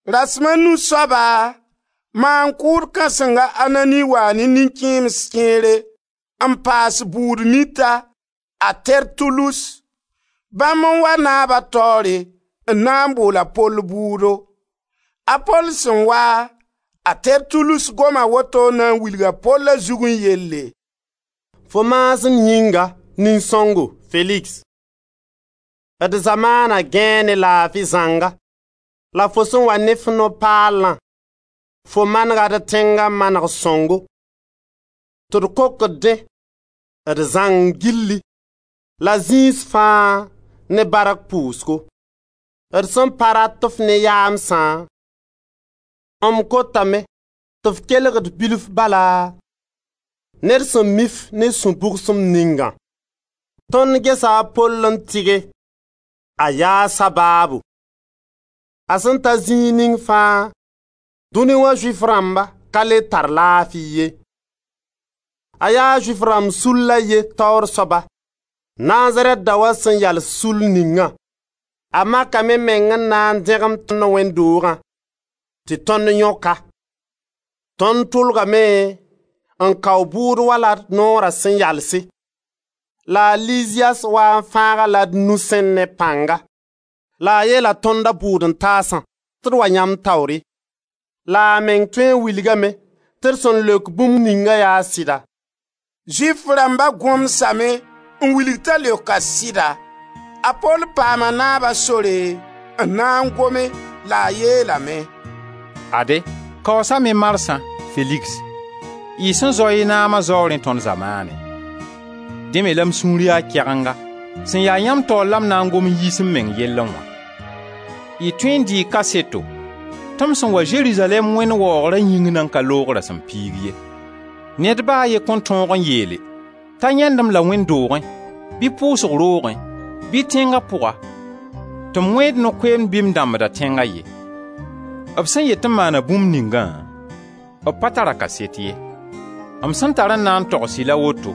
Rasem a nu soaba, maan-kʋʋd Kãseng a Anani waa ne nin-kẽems kẽere n paas bʋʋd mita, a Tertulus. Bãmb n wa naaba taoore n na n boola Pol bʋʋdo. A Pol sẽn wa, a Tertulus goma woto n na wilg a Pol a zugẽ yelle: «Fo maasem yĩnga, nin-sõngo Feligs, d zamaana gãee ne laafi zãnga la fo sẽn wa ne f no-paalã, fo manega d tẽnga maneg sõngo tɩ d kokd dẽ, d zãng gilli, la zĩis fãa, ne bark pʋʋsgo. D sẽn pa rat-f ne yaamsã, m kotame tɩ f kelg d bilf bala ne d sẽn mi-f ne sũ-bʋgsem ningã. Tõnd gesa a Pol n tɩge, a yaa sabaabo. A sẽn ta zĩig ning fãa dũni wã Zʋɩf rãmba ka le tar laafi ye. A yaa Zʋɩf rãmb sull a ye taoor soaba, Nazarɛt daoã sẽn yals sull ningã. A makame meng n na n dẽgem tõnd wẽnd doogã, tɩ tõnd yõk-a. Tõnd tʋlgame n kao bʋʋdo wala d noora sẽn yalse, [ la a Liziyas waa n fãag-a la d nusẽ ne pãnga, la a yeela tõnd, a bʋʋd-n-taasã, tɩ d wa yãmb taoore,] la a meng tõee n wilgame tɩ d sẽn leok bũmb ninga yaa sɩda.» Zʋɩf rãmba gõmsame n wilg t'a leoka sɩda. A Pol paama naaba sore n na n gome la a yeelame: «Ade, kaoosame marsã, Feligs, y sẽn zao y naama zaoorẽ tõnd zamaanẽ; dẽ me la m sũur ya kɛgenga, sẽn ya yãmb taoor la m na n gom n yiis m meng yellẽ wã. Y tõe n dɩɩ kaseto tɩ m sẽn wa Zerizalɛɛm, Wẽnd waoogra yĩng nan ka loog rasem piig ye. Ned ba a ye kõn tõog n yeele t'a yãend-m la wẽnd doogẽ, bɩ pʋʋsg roogẽ, bɩ tẽnga pʋga tɩ m wẽed no-koeemd bɩ m dãmbda tẽnga ye. B sẽn yet tɩ m maana bũmb ningã, b pa tara kaset ye. M sẽn tar n na n togs-y la woto: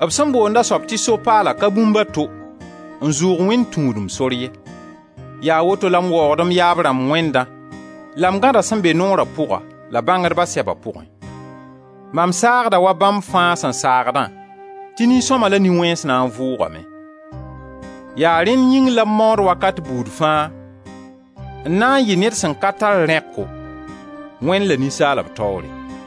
B sẽn boond a soab tɩ So-paalã ka bũmb a to n zʋʋg Wẽnd tũudem sor ye. Yaa woto la m waoogd m yaab rãmb Wẽndã, la m gãda sẽn be Noora pʋga la bãngdba sɛba pʋgẽ. Mam saagda wa bãmb fãa sẽn saagdã tɩ nin-sõma la nin-wẽns na n vʋʋgame. Yaa rẽnd yĩng la m maood wakat buud fãa n na n yɩ ned sẽn ka tar rẽko, Wẽnd la ninsaalb taoore.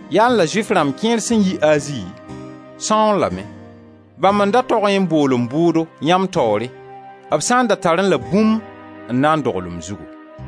Yaẽ la Zʋɩf rãmb kẽer sẽn yi Azi, sãooẽ lame. Bãmb n da togẽ n bool m bʋʋdo yãmb taoore, b sã n da tarẽ la bũmb n na n dogl m zugu.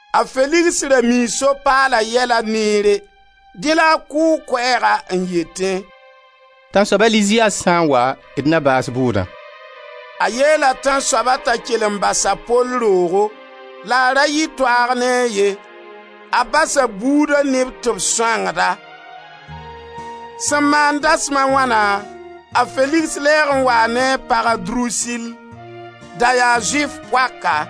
A Feligs ra mii So-paala yɛla neere, dẽ la a kʋʋg koɛɛga n yetẽ: «Tãnsoab a Liziyas sã n wa d na baas bʋʋdã.» A yeela tãnsoaba t'a kell n bas a Pol roogo, la a ra yɩ toaag ne a ye, a bas a buuda neb tɩ b sõangd-a. Sẽn maan dasem a wãna, a Feligs lɛɛg n waa ne a pag a Drusil. Da yaa Zʋɩf poaka.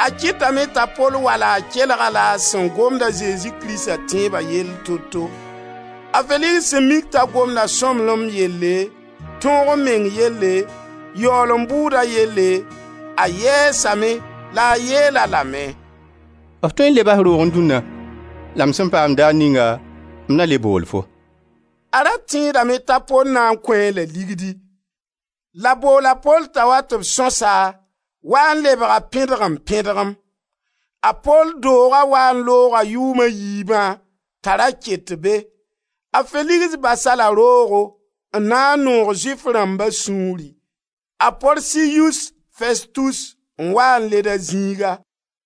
A kɩtame t'a Pol wa la a kelga a sẽn gomd a Zezi Krista tẽeba yell toto. A Feligs sẽn mik t'a gomda sõmblem yelle, tõog-m-meng yelle, yaoolem bʋʋda yelle, a yɛɛsame la a yeel-a lame: «F tõe n leba f roogẽ dũnna, la m sẽn paam daar ninga m na le bool fo.» A ra tẽedame t'a Pol na n kõ-a la ligdi; la bool a Pol t'a wa tɩ b sõsa waa n lebga pẽdgem-pẽdgem. A Pol dooga waa n looga yʋʋm a yiibã ta ra ket be. A Feligs bas-a-la roogo n na n noog Zʋɩf rãmba sũuri. A Porsiyus Festus n waa n led a zĩiga.